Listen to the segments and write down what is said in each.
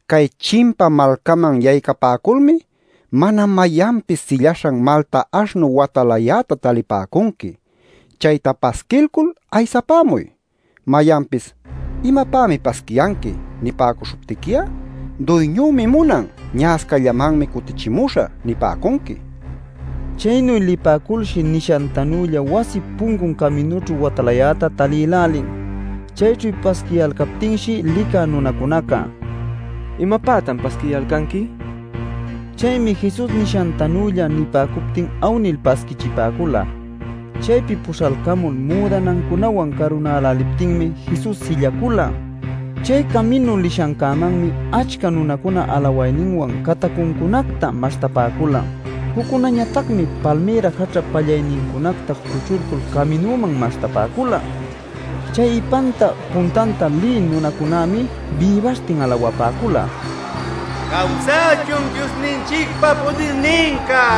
“Cay chimpa malcaman yaycapäculmi mana mayanpis sillaśhan malta aśhnu watalayäta talipäcunqui. Chayta pasquilcul aysapämuy. Mayanpis ‘¿imapämi pasquiyanqui?’ nipäcuśhuptiqui'a ‘Duyñümi munan; ña'ascallamanmi cutichimuśhä’ nipäcunqui” nin. Chaynu lipäculshi nishantanülla wasip puncun caminućhu watalayäta talïlälin. Chayćhu pasquiyalcaptinshi licä nunacunaca: “¿Imapätan pasquiyalcanqui?” nin. Chaymi Jesus nishantanülla nipäcuptin awnil pasquichipäcula. Chaypi puśhalcamul müdanancunawan carunäläliptinmi Jesus sillacula. Chay caminu lishancämanmi achca nunacuna alawayninwan catacuncunacta maśhtapäcula. Juccunañatacmi palmïra jaćhap pallaynincunacta cuchulcul caminuman maśhtapäcula. Chay ipanta puntanta lï nunacunämi bïbaśhtin alawapäcula: “¡Cawsachun Diosninchicpa pudirninca!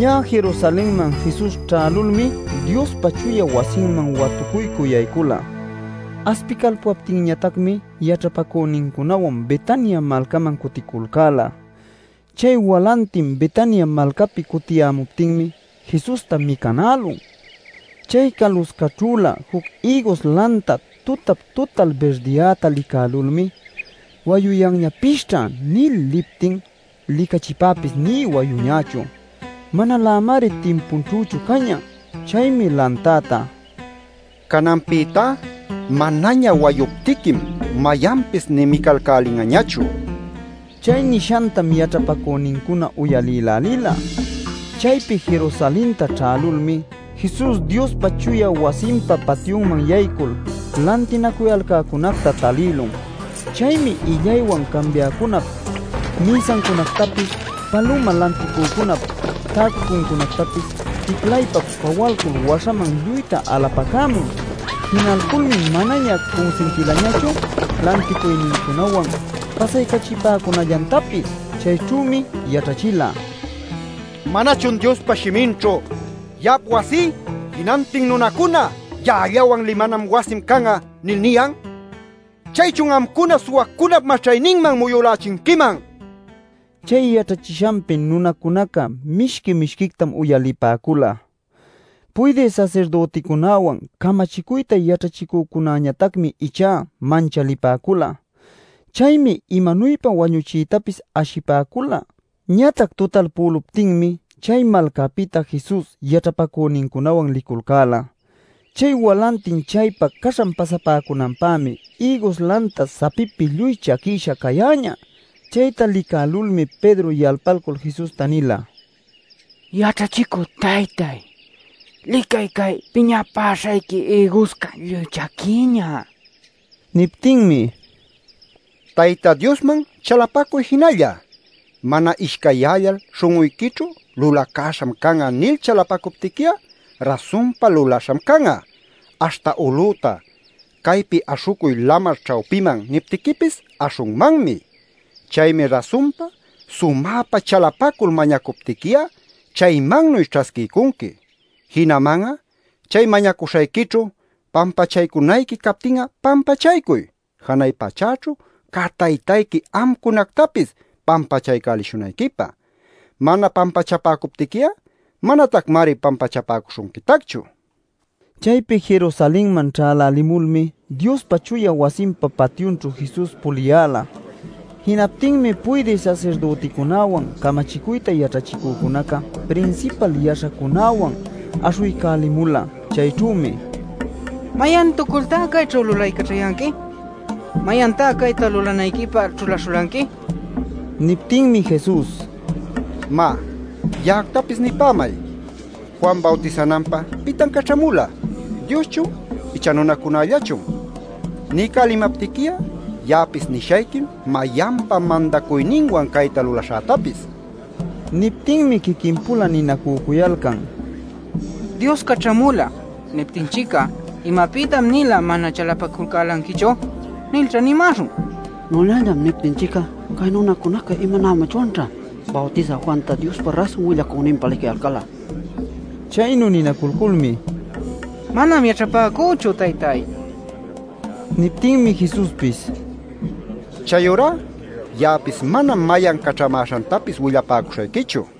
Ñä Jerusalenman Jesus ćhälulmi Diospa chuya wasinman watucuycü yaycula. Aspicalpuyaptinñatacmi yaćhapäcünincunawan Betania malcaman cuticulcäla. Chay walantin Betania malcapi cutiyämuptinmi Jesusta micanälun. Chay caluscaćhülä juc ïgus lanta tutap-tutal birdiyäta licälulmi “wayuyanñapisćha” nil liptin licachipäpis nï wayuñächu. Manalämari timpunćhüchu cañä. Chaymi lantäta: “¡Cananpïtá manaña wayuptiquim mayanpis nï micalcälin'añachu!” nin. Chay nishantam yaćhapacünincuna uyalïlälila. Chaypi Jerusalenta ćhälulmi, Jesus Diospa chuya wasinpa patyunman yaycul lantinacuyalcäcunacta talïlun. Chaymi illaywan cambiäcunap mïsancunactapis paluma lanticücunap täcunancunactapis ticlaypa-pawalcul waśhaman lluyta alapacämun. Jinalculmi manaña cunsintilañachu lanticuynincunawan pasaycaćhapäcunallantapis. Chayćhümi yaćhachila: “¿Manachun Diospa shiminćhu ‘Ya'ap wasí jinantin nunacuna ya'allawan limanan wasim can'a’ nil niyan? ¡Chaychun amcuna suwacunap maćhayninman muyulächinquiman!” nil. Chay yaćhachishanpi nunacunaca mishqui-mishquictam uyalipäcula. Puydï sasirdüticunäwan camachicuyta yaćhachicücunäñatacmi ichá manchalipäcula. Chaymi imanuypa wañuchiytapis ashipäcula. Ñatac tutalpüluptinmi chay malcapïta Jesus yaćhapacünincunawan liculcäla. Chay walantin chaypa caśhan pasapäcunanpämi ïgus lanta sapipi lluy chaquisha cayäñä. Chayta licälulmi Pedro yalpalcul Jesusta nila: “¡Yaćhachicü taytáy, licay, cay piñapäśhayqui ïguscá lluy chaquïñä!” nil. Niptinmi: “Tayta Diosman chalapacuy jinalla. Mana ishcayyällal śhun'uyquićhu ‘Lulacaśham can'a’ nil chalapacuptiqui'a rasunpa lulaśham can'a; aśhta ulüta ‘Caypi aśhucuy lamar ćhawpiman’ niptiquipis aśhunmanmi. Chaymi rasunpa sumäpa chalapacul mañacuptiqui'a chaymannuy ćhasquiycunqui. Jinaman'a chay mañacuśhayquićhu pampachaycunayqui captin'a pampachaycuy, janay pachäćhu cä Taytayqui amcunactapis pampachaycälishunayquipä. Mana pampachapäcuptiqui'a manatacmari pampachapäcuśhunquitacchu” nin. Chaypi Jerusalenman ćhälälimulmi Diospa chuya wasinpa patyunćhu Jesus puliyäla. Jinaptinmi puydï sasirdüticunäwan, camachicuyta yaćhachicücunaca, prinsipal yaśhacunawan aśhuycälimula. Chayćhümi: “¡¿Mayantucultá cayćhu lulaycaćhayanqui? ¿Mayantá cayta lulanayquipä ćhulaśhulanqui?!” nipäcula. Niptinmi Jesus: “Má, ya'actapis nipämay: Juan bawtisananpä ¿pitan caćhamula? ¿Dioschun icha nunacunällachun? Niycälimaptiqui'a ya'apis nishayquim mayanpa mandacuyninwan cayta lulaśhätapis” nil. Niptinmi quiquin-pula ninacücuyalcan: “ ‘Dios caćhamula’ niptinchic'a ‘¿Imapïtan-nila mana chalapaculcälanquichu?’ nilćha nimäśhun. ‘Nunallam’ niptinchic'a cay nunacunaca imanämachwanćha, Bawtisä Juanta Diospa rasun willacüninpa licayalcal'a” nil. Chaynu ninaculculmi: “Manam yaćhapäcüchu, taytay” nin. Niptinmi Jesuspis: “Chayurá ya'apis manam mayan caćhamäśhantapis willapäcuśhayquichu” nin.